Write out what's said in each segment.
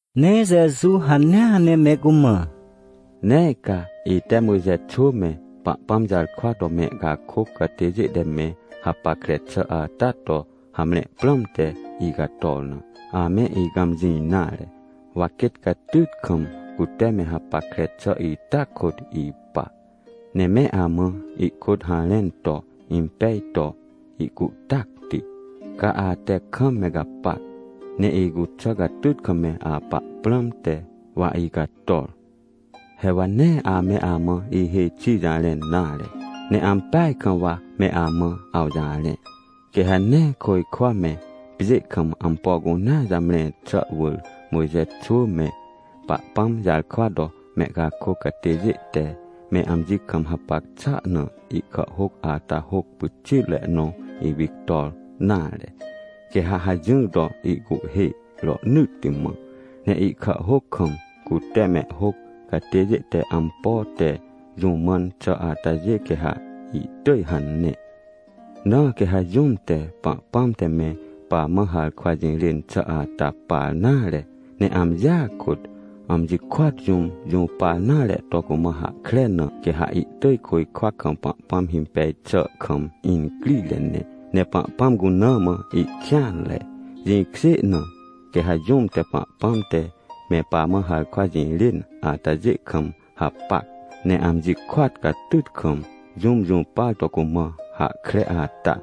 Ne Jeju hanea ne me cumã: — Nee ca, ite Mojxe xwỳ me, Pahpãm jarkwa to mehcakôc catêjê te me hapackre xà ata to hamre prãmte icator na, ame icãmjĩ nare. Wa quêt catyt kam, cute me hapackre xà ita kôt ipa, ne me amã ihkôt harẽn to impej to ihcuhtacti, ca ate kam me gapac, ne icuxà catyt kam me apa prãmte, wa icator. — He wa nee ame amã ihêj xi jarẽn nare, ne ampeaj kam wa me amã awjarẽ. Quê ha nee côjkwa me, pjê kam ampo cunea jamre xà wỳr Mojxe xwỳ me Pahpãm jarkwa to mehcakôc catêjê te me amji kam hapac xà na ihkàhhôc ata hôc pyxitre nõ ipictor nare. Quê ha hajỹr to ihcuhhê rohnỳtti mã, ne ihkàhhôc kam cute mehhôc catêjê te ampo te jũ mãn xà atajê quê ha ihtỳj hane. Na quê ha jũm te Pahpãm te me pamã harkwa jirên xà ata par nare, ne amjia kôt, amji kôat jũm jũpar nare to cumã hahkre na, quê ha ihtỳj côjkwa kam Pahpãm himpej xà kam incrire ne, ne Pahpãm cuna mã ihkêanre. Jĩkjê na, quê ha jũm te Pahpãm te me pamã harkwa jirên atajê kam hapac, ne amji kôat catyt kam, jũm jũpar to cumã hahkre ata,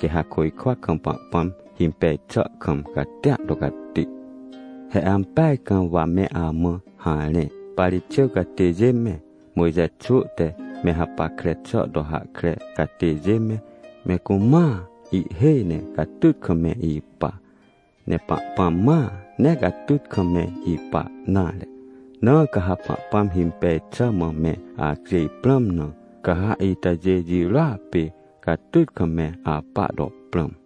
quê ha côjkwa kam Pahpãm himpej xà kam catia to cati. — He ampeaj kam wa me amã harẽ. Parixêw catêjê me, Mojxe xwỳ te me hapackre xà to hahkre catêjê me, me cumãa ihhêj ne catyt kam me ipa. Ne Pahpãm mãa nee catyt kam me ipa nare. Na ca ha Pahpãm himpej xà mã me acjêj prãm na, ca ha itajê jirôa pê catyt kam me apa to prãm.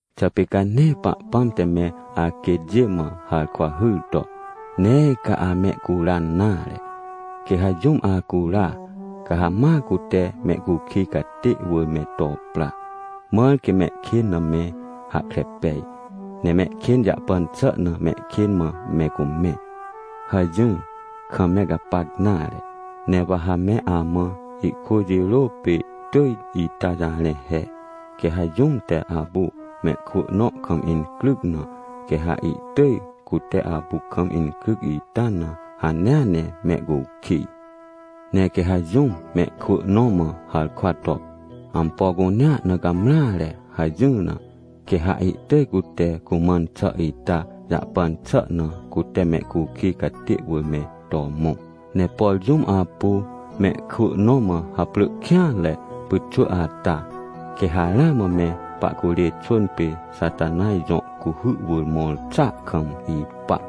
— Xà pê ca nee Pahpãm te me aquêtjê mã harkwa hyr to: “Nee ca amehcuran nare. Quê ha jũm ahcura, ca ha ma cute mehcukij catê wỳr me to pra, mãr quê mehkên na me hahkre pej, ne mehkên jahpan xà na mehkên mã me cumẽ” hajỹr kam me gapac nare? Ne wa ha me amã ihkwỳ jirô pê tỳj ita jarẽ he: “Quê ha jũm te apu mehkwỳ nõ kam incryc na, quê ha ihtỳj cute apu kam incryc ita na hanea ne mehcukij. Ne quê ha jũm mehkwỳ nõ mã harkwa to: ‘Ampo cunea na gamreare’ hajỹr na, quê ha ihtỳj cute cumãn xà ita jahpan xà na cute mehcukij catê wỳr me to mõ. Ne por jũm apu mehkwỳ nõ mã haprỳ kêanre pyxwỳ ata, quê ha ramã me pahcurê xwỳn pê Xatanaj jõ cuhy wỳr mõr xàa kam ipa”.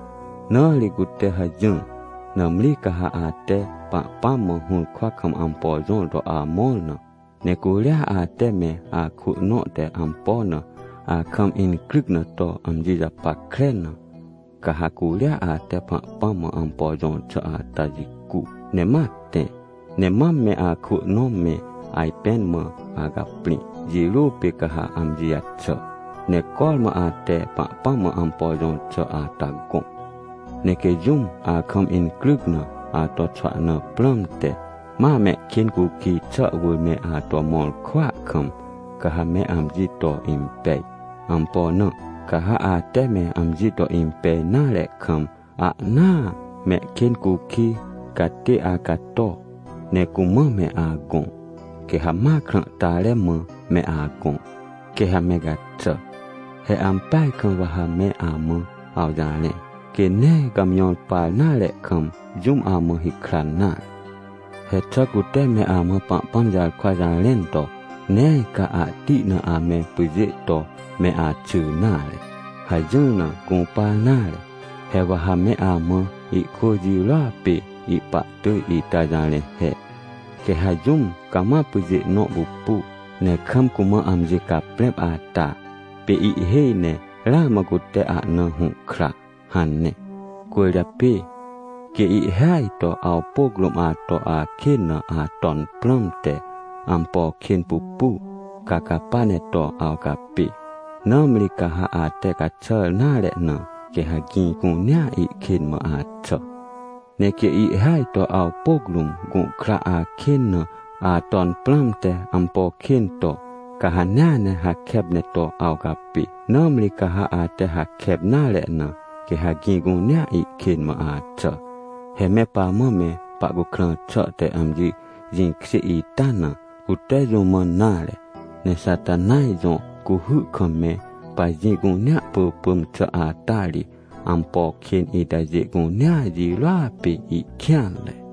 — Na ri cute hajỹr. Nãmri ca ha ate Pahpãm mã hũrkwa kam ampo jõr to amõr na, ne curia ate me akwỳ nõ te ampo na akam incryc na to amji japackre na, ca ha curia ate Pahpãm mã ampo jõr xà ata jicu, ne ma tẽ ne mam me akwỳ nõ me ajpẽn mã acaprĩ, jirô pê ca ha amji jaxà, ne cormã ate Pahpãm mã ampo jõr xà ata gõ. — Ne quê jũm akam incryc na, ato xwahna prãmte, ma mehkên cukij xà wỳr me ato mõr kwỳa kam, ca ha me amji to impej. Ampo na? Ca ha ate me amji to impej nare kam ahnaa mehkên cukij catê acato, ne cumã me agõ, quê ha ma krãhtare mã me agõ, quê ha me gaxà. He ampeaj kam wa ha me amã awjarẽ. Quê nee gàmjõr par nare kam, jũm amã hikran nare. — He xà cute me amã Pahpãm jarkwa jarẽn to: “Nee ca ahti na ame pyjê to me axy nare” hajỹr na gũpar nare? He wa ha me amã ihkwỳ jirôa pê ihpa tỳj ita jarẽ he: “Quê ha jũm cama pyjê nõ pupu, ne kam cumã amji caprẽp ata, pê ihhêj ne ramã cute ahna hũhkra” hane. — Cwỳrjapê quê ihhêaj to awpôc rũm ato akên na aton prãmte ampo kên pupu, ca capa ne to awcapê. Nãmri ca ha ate caxàr nare na, quê ha gĩ cunea ihkên mã axà. Ne quê ihhêaj to awpôc rũm gũhkra akên na aton prãmte ampo kên to, ca hanea ne hakep ne to awcapê. Nãmri ca ha ate hakep nare na, quê ha gĩ cunea ihkên mã axà. He me pamã me pahcukrã xà te amji jĩkjê ita na, cute jũ mãn nare, ne Xatanaj jõ cuhy kam me pajĩ cunea pỳpỳm xà ata ri ampo kên itajê cunea jirôa pê ihkêanre.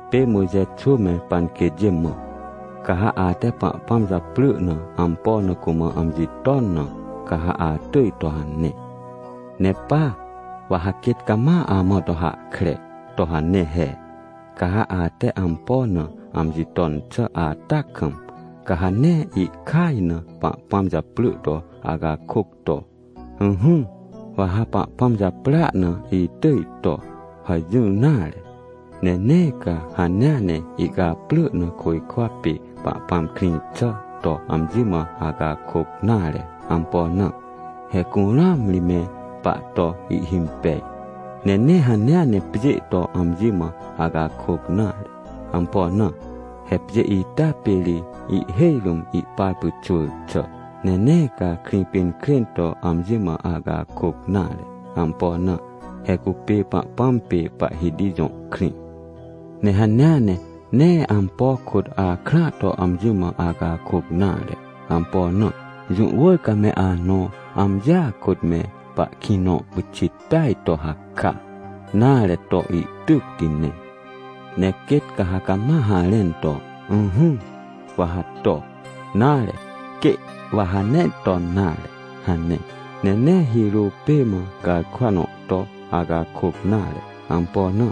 — Pê Mojxe xwỳ me panquêtjê mã: “Ca ha ate Pahpãm japrỳ na ampo na cumã amji ton na, ca ha atỳj to” hane. Ne pa, wa ha quêt cama amã to hahkre to hane he: “Ca ha ate ampo na amji ton xà ata kam, ca ha nee ihkaj na Pahpãm japrỳ to acakôc to, ‘Ỹhỹ, wa ha Pahpãm japrỳa na itỳj to’ hajỹr nare. Ne nee ca hanea ne ihcaprỳ na côjkwa pê Pahpãm krĩ xà to amji mã acakôc nare. Ampo na? He curũam ri me pahto ihhimpej. Ne nee hanea ne pjê to amji mã acakôc nare. Ampo na? He pjê ita pê ri ihhêj rũm ihpar pyxwỳr xà. Ne nee ca Krĩpinkrên to amji mã acakôc nare. Ampo na? He cupê Pahpãm pê Pahhiti jõ krĩ. Ne hanea ne nee ampo kôt akrãa to amji mã acakôc nare. Ampo na? Jũ wỳr ca me anõ amjia kôt me pahkĩ nõ pyxit peaj to haka, nare, to ihtycti ne. Ne quêt ca ha cama harẽn to, ‘Ỹhỹ, wa ha to’, nare, ‘Quê, wa ha nee ton nare’, hane. Ne nee hirô pê mã garkwa nõ to acakôc nare. Ampo na?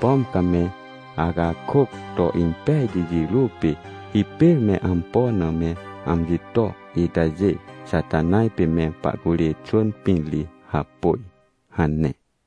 Pom ca me acakôc to impejti jirô pê, hipêr me ampo na me amji to itajê, Xatanaj pê me pahcurê xwỳn pĩn ri hapôj” hane.